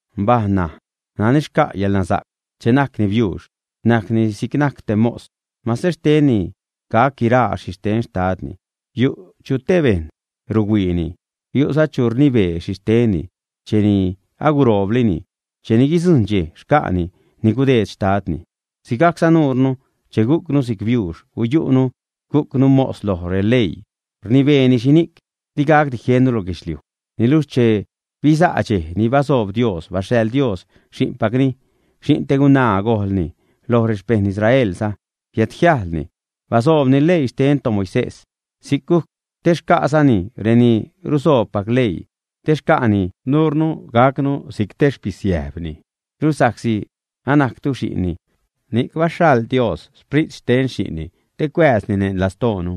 Mbaj ṉaj. Nani xca' yäḻnasa'c, che najcni biuux, najcni sigajc te mos, mase xtenni gac guiraa xhixten xtadni. Yu' chu te bejṉ ruhuiini, yu'za chu rnibee xhixtenni cheni agurooblini, cheni guidzujṉ dxej xca'ni ni gudeed xtadni. Sigajcza nuure che gucnu si'c biuux guyu'nu gucnu mos loj releii, rnibeeni xhini'c digacdi jieṉnu lo guedxliuj. Niluxh che bisa' dxej ni basoob Dios, baxhaḻ Dios Xi'npacni. Xi'n te gunaa gojḻni, loj rexpejṉ Israelza biädjiäjlni, basoobni leii xten toMoisés. Si'c gujc te xcasacni reni rusoobpac leii, te xca'ni nuure gacnu si'c te xpisiäjbni. Luxh sa'csi anajctu xi'nni, ni'c baxhaḻ Dios Sprit xten Xi'nni te cuääzni neṉ lastoonu.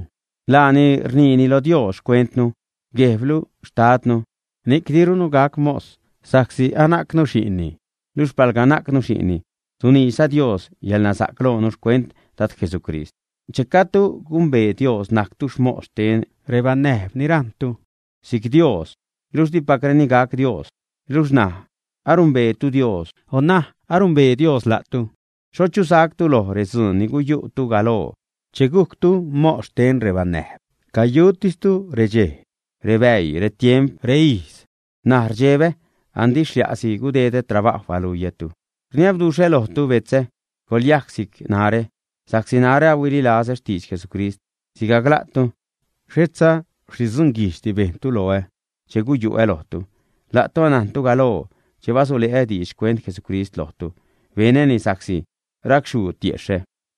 Laani rniini lo Dios xcuentnu: “Guejblu, Xtadnu.” Ni'c dirunu gac mos, sa'csi anajcnu xi'nni. Luxh palga najcnu xi'nni, suniidxza Dios yäḻnasa'c loonu xcuent Dad Jesucrist. Che gajdtu gumbee Dios najctu mos xten rebanäjb ni rajṉtu si'c Dios luxh dipacreni gac Dios. Luxh ṉaj anumbeetu Dios o ṉaj anumbee Dios la'tu, xho chachusactu loj redzuun ni guyu'tu galoo che gujctu mos xten rebanäjb. Cayutistu redxej, rebäii, retiemp, reijz. N̲aj rdxebä andi xlia'si gudedä trabajw baluiätu. Rniabduxhä lojtu betzä, coḻyajc si'c narä, sa'csi narä ahuililazä xtidx Jesucrist sigajc la'tu. Xhetza xhi dzunguijdxdi bejntu loä che guyu'ä lojtu. La'tu anajntu galoo che basule'ä diidx xcuent Jesucrist lojtu, benäni sa'csi racxhuu tiexhä.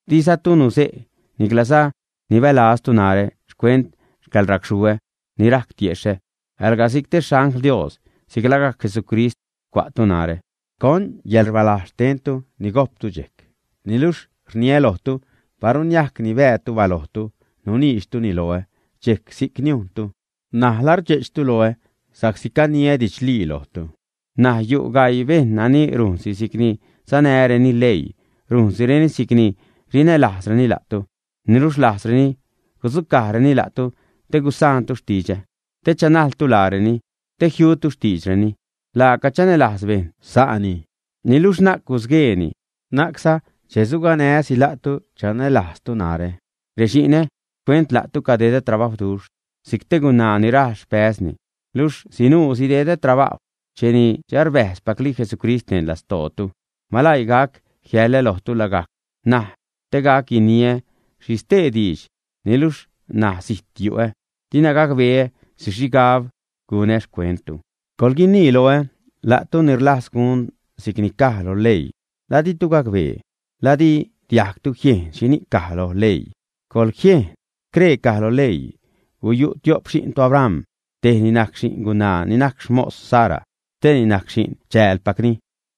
Dizatu nuze' niclaza nibälajztu narä xcuent yäḻracxhuu ni rajc tiexhä, alga si'c te xangl Dios, si'c lagajc Jesucrist cua'tu narä. ¿Con yäḻrbalajz xtentu ni gojptu dxejc? Niluxh rniä lojtu, paru niajc nibäätu balojtu, nuniidxtuni loä dxejc, si'c niujntu. N̲aj ¿la rdxe'chtu loä sa'csi caniä didxlii lojtu, ä? N̲aj yu' gaii bejṉ nani rujnsi si'cni sanäreni leii rujnsireni si'cni rinälajzreni la'tu. Niluxh rlajzreni gudzucajreni la'tu te gusaantu xtidxä, te chanajltu laareni, te jiutu xtiidxreni. Laaca chanälajz bejṉ sa'ni, niluxh na'c gusgueeni, na'cza che suganää́si la'tu chanälajztu narä. Rexi'nä, xcuent la'tu cadedä trabajwduxh si'c te gunaa ni rajl xpäzni, luxh sinuu sidedä trabajw cheni arbäjzpacli Jesucrist neṉ lastootu. Maläii gac jiälä lojtu lagajc ṉaj te gac guiniä xhi stee diidx. Niluxh ṉaj zijt yu'ä, dina gacbeä xhi xhigab gunä xcuenttu. Coḻguinii loä, la'tu ni rlajz gun si'cni caj lo leii, ¿la ditu gacbee, la di diajgtu jiejn xhini'c caj lo leii, ä? ¡Coḻjiejn! Scree caj loj leii: guyu' tio'p xi'n toAbram. Tejni najc xi'n gunaa ni najc xmos Sara. Steeni najc xi'n chäälpacni.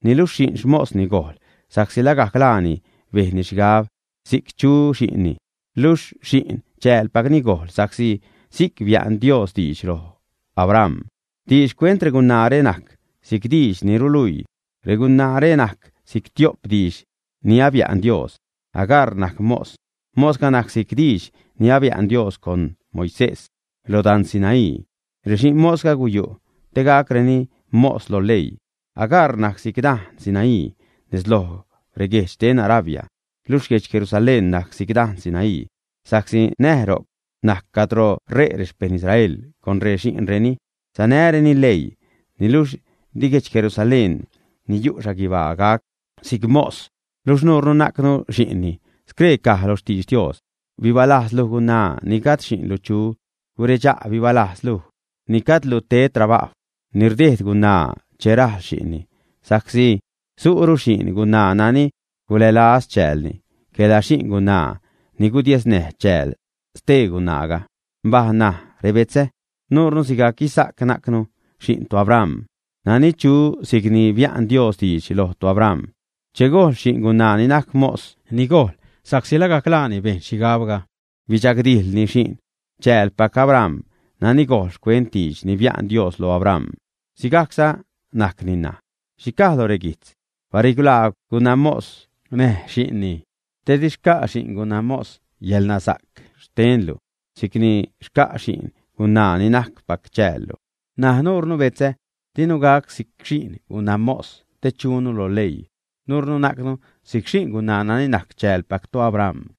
Niluxh xi'n xmosni gojl sa'csi lagajc laani bejnni xhigab si'c chu xi'nni. Luxh xi'n chäälpacni gojl sa'csi si'c bia'n Dios diidx loj Abram. Diidx xcuent regunaare najc si'c diidx ni ruluii. Regunaare najc si'c tio'p diidx ni bia'n Dios. Agar najc mos, mosga najc si'c diidx ni bia'n Dios con Moisés lo dan Sinaí. Rexi'n mosga guyu' te gacreni mos lo leii. Agar najc si'c dan Sinaí nez lo reguejdx xten Arabia. Luxh guedx Jerusalén najc si'c dan Sinaí, sa'csi ṉaj ro'c najc cadro ṟe' rexpeṉ Israel con rexi'nreni, sanäreni leii. Niluxh di guedx Jerusalén ni yu' guibaa gac si'c mos, luxh nuurnu najcnu xi'nni. Scree caj loj xtidx Dios: Bibalajz, luj gunaa ni gajd xi'nlu chu, guredxa', bibalajz, luj ni gajdlu ted trabajw ni rdejd gunaa che rajl xi'nni. Sa'csi su'ru xi'n gunaa nani gulälajz chäälni quela xi'n gunaa ni gudiesnäj chääl stee gunaaga. Mbaj ṉaj, rebetzä, nuure, sigajc Isaac, najcnu xi'n toAbram nani chu si'cni bia'n Dios diidx loj toAbram. Che gojl xi'n gunaa ni najc mos, ni gojl sa'csi lagajc laani bejn xhigabga, bidxagdijḻni xi'n chäälpac Abram nani gojl xcuent diidx ni bia'n Dios loj Abram. Sigajcza najcni ṉaj. ¿Xhi caj lo reguijtz? “Barilaagw gunamos näj xi'nni, te di xca' xi'n gunamos yäḻnasa'c xtenlu si'c ni xca' xi'n gunaa nani najc chäälpaclu.” N̲aj nuure, betzä, dinu gac si'c xi'n gunamos te chunu lo leii. Nuurnu najcnu si'c xi'n gunaa nani najc chäälpac toAbram.